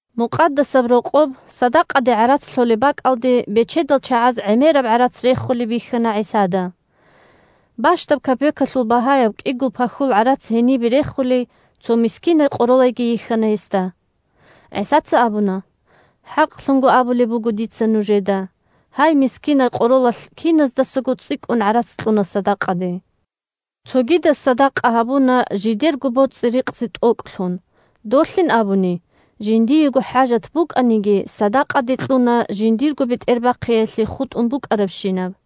Мукъадасаб Рокъоб садакъаде гӀарац лъолеб бакӀалде бечедал чагӀаз гӀемераб гӀарац рехулеб бихьана ГӀисада. Бащдаб капекалъул багьаяб кӀиго пахьул гӀарац гьенибе рехулей цо мискинай къоролайги йихьана гьесда. ГӀисаца абуна: – ХӀакълъун абулеб буго дица нужеда: гьай мискинай къоролалъ киназдасаго цӀикӀкӀун гӀарац кьуна садакъаде. Цогидаз садакъа гьабуна жидерго боцӀи-рикъзи тӀокӀлъун, долъин абуни, жиндиего хӀажат букӀаниги, садакъаде кьуна жиндирго бетӀербахъиялъе хутӀун букӀарабщинаб.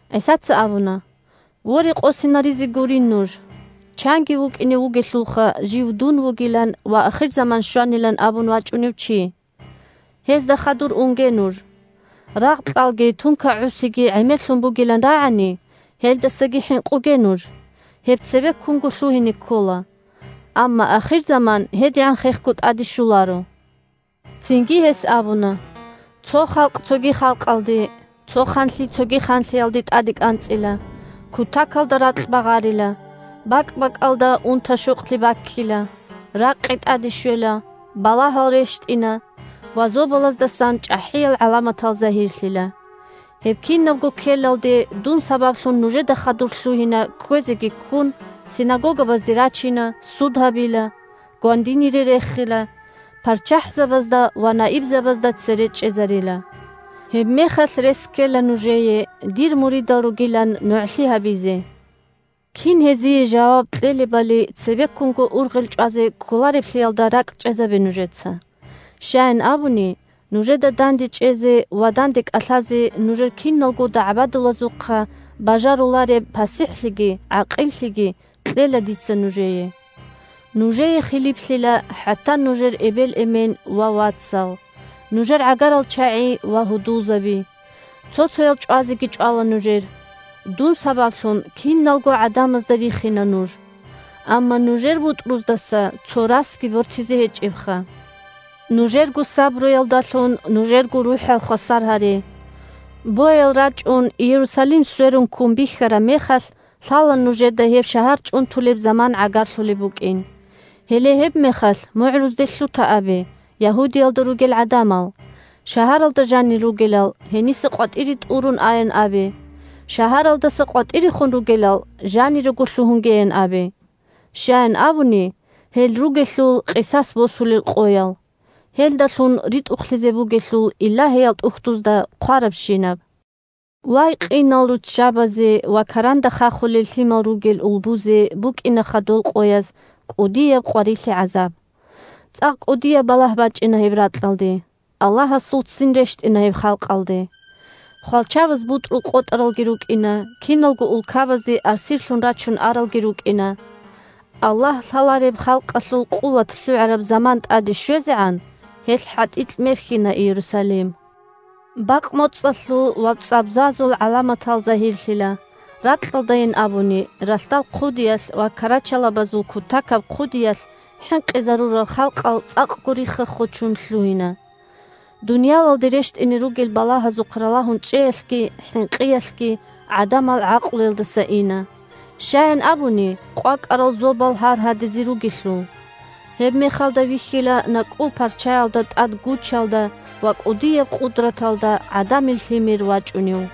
ГӀисаца абуна: – Воре, къосинаризе гурин нуж! Чанги вукӀине вугелъулха, жив дун вугилан ва ахирзаман щванилан абун вачӀунев чи. Гьезда хадур унге нуж. Рагъ-кьалги тунка-гӀусиги гӀемерлъун бугилан рагӀани, гьелдасаги хӀинкъуге нуж. Гьеб цебеккунго лъугьине ккола, амма ахирзаман гьедигӀан хехго тӀаде щоларо. Цинги гьес абуна: – Цо халкъ цоги халкъалде, цо ханлъи цоги ханлъиялде тӀаде кӀанцӀила. Кутакалда ракь багъарила, бакӀ-бакӀалда унта-щокълъи баккила, ракъи тӀаде щвела, балагьал рещтӀина ва зобалаздасан чӀахӀиял гӀаламатал загьирлъила. Гьеб кинабго ккелалде, дун сабаблъун нужеда хадур лъугьина, кквезеги ккун, синагогабазде рачина, суд гьабила, гвандинире рехила, парччахӀзабазда ва наибзабазда цере чӀезарила. Гьебмехалъ рес ккела нужее, дир муридал ругилан нугӀлъи гьабизе. Кин гьезие жаваб кьелебали цебеккунго ургъел чӀвазе кколареблъиялда ракӀчӀезабе нужеца. Щаян абуни, нужеда дандечӀезе ва данде кӀалъазе нужер киналго дагӀбадулазухъа бажарулареб пасихӀлъиги гӀакъиллъиги кьела дица нужее. Нужее хилиплъила хӀатта нужер эбел-эмен ва вацал, нужер гӀагарал чагӀи ва гьудулзаби. Цо-цоял чӀвазеги чӀвала нужер. Дун сабаблъун киналго гӀадамазда рихина нуж. Амма нужер бутӀруздаса цо расги бортизе гьечӀебха. Нужерго сабруялдалъун нужерго рухӀал хвасар гьаре. Боял рачӀун, Иерусалим сверун ккун бихьараб мехалъ, лъала нужеда гьеб шагьар чӀунтулеб заман гӀагарлъулеб букӀин. Гьеле гьебмехалъ мугӀрузде лъута абе Ягьудиялда ругел гӀадамал. Шагьаралда жанир ругелал гьениса къватӀире тӀурун аян абе, шагьаралдаса къватӀирехун ругелал жанирего лъугьунгеян абе. Щаян абуни, гьел ругелъул къисас босулел къоял, гьелдалъун ритӀухълъизе бугелъул Илагьиял ТӀухьдузда хъварабщинаб. Вай, къинал руччабазе ва каранда хахулел лъимал ругел улбузе букӀинаха дол къояз кӀудияб къварилъи-гӀазаб! ЦӀакъ кӀудияб балагь бачӀина гьеб ракьалде, Аллагьасул ццин рещтӀина гьеб халкъалде! Хвалчабаз бутӀрул къотӀаралги рукӀина, киналго улкабазде асирлъун рачун аралги рукӀина. Аллагь лъалареб халкъалъул къуват лъугӀараб заман тӀаде щвезегӀан, гьелъ хӀатӀикь мерхьина Иерусалим. Бакъ-моцӀалъул ва цӀвабзазул гӀаламатал загьирлъила, ракьалдайин абуни, ралъдал хъудиялъ ва карачалабазул кутакаб хъуялъ хӀинкъизарурал халкъал цӀакъго рихха-хочун лъугьина. Дуниялалде рещтӀине ругел балагьазухъ ралагьун чӀеялъги хӀинкъиялъги гӀадамал гӀакълуялдаса ина. Щаян абуни, къвакӀарал зобал гьаргьадизе ругелъул. Гьебмехалда вихьила накӀкӀул парчаялда тӀад гучалда ва кӀудияб къудраталда ГӀадамил Лъимер вачӀунев.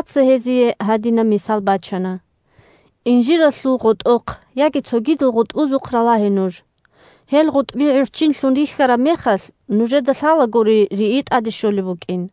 ГӀисаца гьезие гьадинаб мисал бачана: – Инжиралъул гъотӀохъ яги цогидал гъутӀбузухъ ралагье нуж. Гьел гъутӀби гӀурччинлъун рихьараб мехалъ, нужеда лъалагури рии тӀаде щолеб букӀин.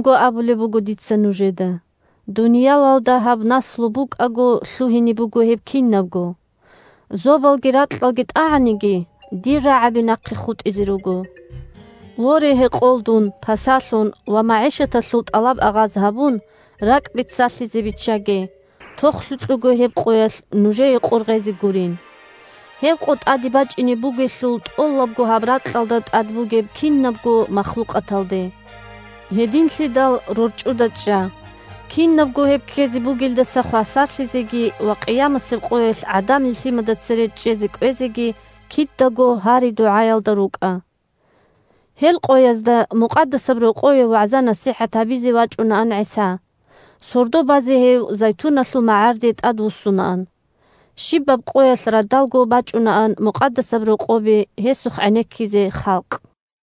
ХӀакълъун абулеб буго дица нужеда: дуниялалда гьаб наслу букӀаго лъугьине буго гьеб кинабго. Зобалги ракьалги тӀагӀаниги, дир рагӀаби нахъе хутӀизе руго. Воре, гьекъолдун, пасалъун ва магӀишаталъул тӀалаб-агъаз гьабун, ракӀ бицалъизе биччаге, тохлъукьего гьеб къоялъ нужее къор гъезе гурин. Гьеб къо тӀаде бачӀине бугелъул тӀолабго гьаб ракьалда тӀад бугеб кинабго махлукъаталде! Гьединлъидал рорчӀуда чӀа! Кинабго гьеб ккезе бугелдаса хвасарлъизеги ва къиямасеб къоялъ ГӀадамил Лъимада цере чӀезе кӀвезеги кидаго гьари-дугӀаялда рукӀа. Гьел къоязда Мукъадасаб Рокъове вагӀза-насихӀат гьабизе вачӀунаан ГӀиса. Сордо базе гьев Зайтуналъул магӀарде тӀадвуссунаан. Щибаб къоялъ радалго бачӀунаан Мукъадасаб Рокъобе гьесухъ гӀенеккизе халкъ.